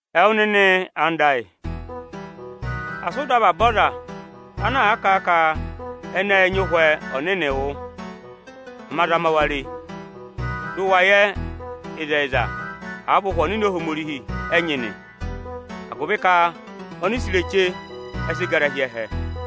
Ẹwụ nịnị anda ayị, asị ụ dọ avaba aza ana kà a ka ẹnị ẹ́ẹ nyị Ụhwẹ Ọnịnị wụ́. Ama zama wa re, dị ụ wa yẹ ịzẹyịza àa vị Ụhwẹ Ọnịnị Ohomorihi ẹ nyị nị, agụvị ka ọnịsẹ onireche ẹ sị gara hi ẹhẹ.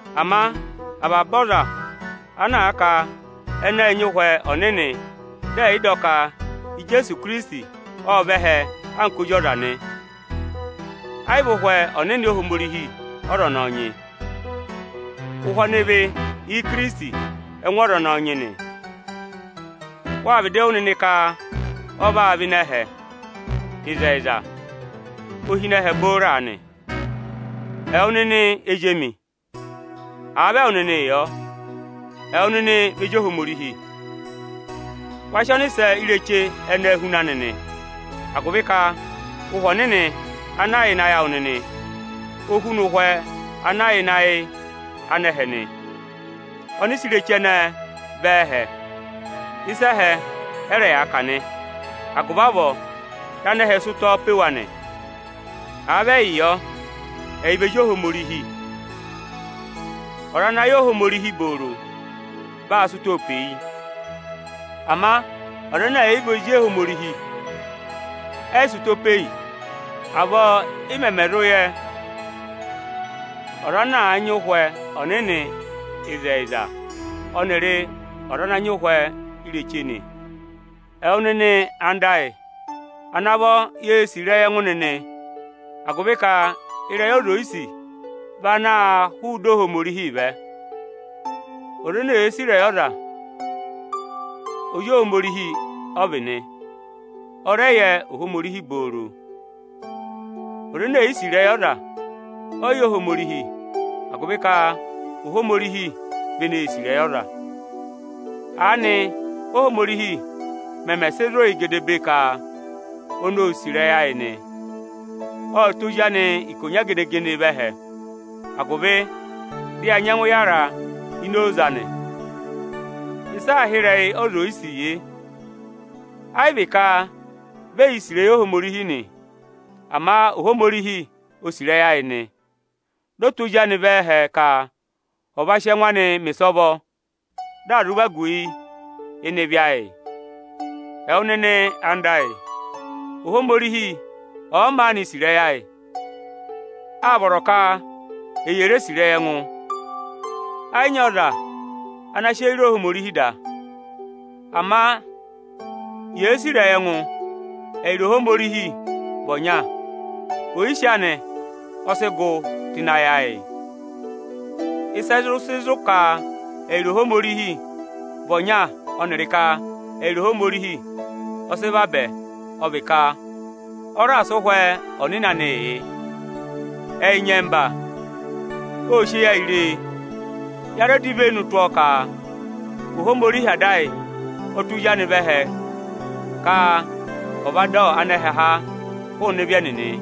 Ama ọza tụra ọza ẹnị ẹ̀ yị dọ ka Ijeesu Ikirisiti ộ vẹ ẹhẹ anka ozi ọza, ẹ́ yị vị Ụhwẹ Ọnịnị Ohomorihi ọza ọnọọ nyị. Ụhwẹ ọnịvị Ikirisiti ẹ́ngụ ọza ọnọọ nyị nị. Wâ vịdị wụ́ nịnị ka ọ vaa vẹ ịnị ẹhẹ, ịzẹyịza, ọ yà ịnị ẹhẹ booro aanị. Ẹwụ nịnị ezi emi, àa vị ẹwụ nịnị yọ, ẹwụ nịnị vị ezi Ohomorihi, wa sị ọnịsẹ onireche ẹnẹẹ huna nịnị, agụvị ka, Ụhwẹ Ọnịnị ana yà ịnị ayị awụ nịnị, o huna ụhwẹ ana yà ịnị ayị anẹhẹ nị. Ọnịsẹ onireche ẹnẹẹ vị ẹ́ẹhẹ, ịsa ẹhẹ ẹ́ rẹ yaa kà nị, agụvị avọọ anẹhẹ sị ụtọ pe wa nị. Àa vị ẹyị yọ, ẹyị vị ezi Ohomorihi. Ọza ana àa yẹ Ohomorihi ẹtẹẹrẹ vaa sị ụtọọ pe yi. Ama ọza ẹnẹ ẹ̀ yị yẹ Ohomorihi, ẹ́ yị sị ụtọ pe yi. Avọọ ị mẹmẹ zụ yẹ ọza ana nyị Ụhwẹ Ọnịnị ịzẹyịza ọnịrị ọza ana àa nyị ụhwẹ echu nị. Ẹwụ nịnị anda ayị, à navọ yee sì ịrẹyị ẹngụ nịnị, agụvị ka ịrẹyị ọza ò yi sì vị ana hụụ ịdị Ohomorihi vẹ. Ọza ene èe sì ịrẹyị ọza vị ozi Ohomorihi, ọnị ọ yẹ Ohomorihi nị Ọza ene è yi sì ịrẹyị ọza, ẹ́ yị yẹ Ohomorihi, agụvị ka Ohomorihi vị eneē sì ịrẹyị ọza. Aanị Ohomorihi mẹmẹ sị zụ̀ yị gedebee ka oni ô sì ịrẹyị ayị nị: Ọ́ tụ́ Ozi anị ikonya gene-gene vẹ ẹhẹ agụvị dị ya nyẹngụ yara ịnị oze anị. Ịsị aā hị́ ịrẹyị ọza oyisì yị: Ẹ́ yị vị ka vị ẹyị sì ịrẹyị Ohomorihi nị, ama Ohomorihi o sì ịrẹyị ayị nị, dị ọ tụ́ Ozi anị vẹ ẹhẹ ka ọ̀ va sị ẹngụ anị mẹ̀ ịsọvọ, dị à zụ vagu yị ịnị ịvị ayị nị. Ẹwụ nịnị anda ayị, Ohomorihi ọ̀ọ maanị sì ịrẹyị ayị, áa vọrọ ka e yè re sì ịrẹyị ẹngụ. Ẹẹ̀ yị nyị ọza ana sị eyi re Ohomorihi da, ama yèe sì ịrẹyị ẹngụ, ẹyịrị Ohomorihi vị ọnya. Oyisì anị ọ sị gụ tụ́ ịnị ayị ayị. Ịsị ẹ zụ sị zụ̀ ka ẹyịrị Ohomorihi vị ọnya ọnịrị ka ẹyịrị Ohomorihi ọ sị vabẹ, ọ vị ka ọ raà sị Ụhwẹ Ọnịnị anịị yị. Ẹyị nyẹmba ô sị eyi ayị ree, ya rẹ dọ ivenu tụ́ ọ ka Ohomorihi Ada ayị ộ tụ́ Ozi anị vẹ ẹhẹ ka ọ̀ va dọ anẹhẹ há hụụnị ịvị ẹnịnị.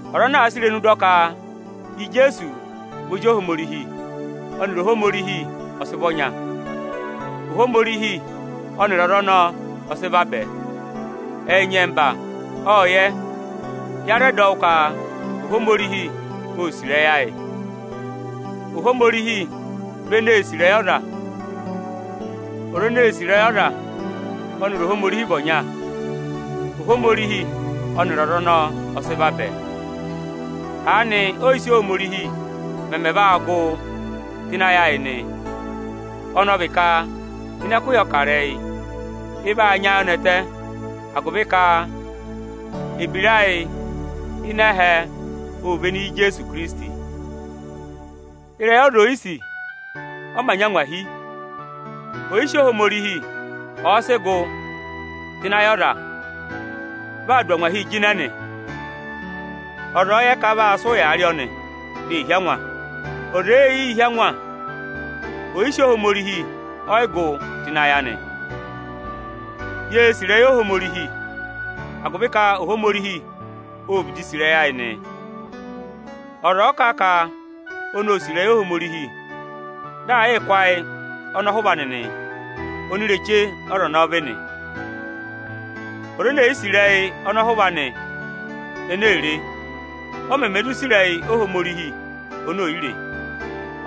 Ọza ana àa há irenu anị kà a ka Ijeesu vị Ozi Ohomorihi, ọnịrị Ohomorihi vị ọnya; Ohomorihi ọnịrị ọza ọnọọ ọ sị vabẹ. Ẹyị nyẹmba ộ yẹ, ya rẹ dọ wụ́ ka Ohomorihi ô sì ịrẹyị ayị, Ohomorihi vị eneē sì ịrẹyị ọza. Ọza eneē sì ịrẹyị ọza, ọnịrị Ohomorihi vị ọnya, Ohomorihi ọnịrị ọza ọnọọ ẹ sị vabẹ. Aanị oyisì Ohomorihi mẹmẹ vaa gụ tụ́ ịnị ayị ayị nị, ọnị ọ vị ka ịnị ẹkụhị ọkarẹyị, ị vaa nyị ayọnẹtẹ agụvị ka ebira ayị ịnị ẹhẹ óo véné Íjeesu Ikirisiti. Ịrẹyị ọza oyisì ọ mā nyị angwahi. Oyisì Ohomorihi ọ̀ọ sị gụ tụ́ ịnị ayị ọza, vaa dụ angwahii jịnẹ nị. Ọza ọ̀ọ yẹ ka a vaa sị ụyaa rị ọnị, dị ee hí angwa. Ọza èe yii hí angwa, oyisì Ohomorihi ọọ̀ yị gụ tụ́ ịnị ayị anị. Yée sì ịrẹyị Ohomorihi agụvị ka ọnị ọ vịdị sì ịrẹyị ayị nị. Ọza ọ̀ọ kà a ka oni óo sì ịrẹyị Ohomorihi, dị aa yịị kụ́ ayị ọnọhụva anị nị, onireche ọza ọnọọ vị nị. Ọza è yi sì ịrẹyị ọnọhụva anị ene ee re, ọ mẹmẹ zụ sì ịrẹyị Ohomorihi ene è yi re?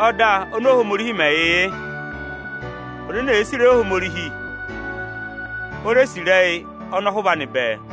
Ọda ọnị Ohomorihi mẹ yị yị: Ọza ene èe sì ịrẹyị Ohomorihi, ò re sì ịrẹyị ọnọhụva anị bẹẹ.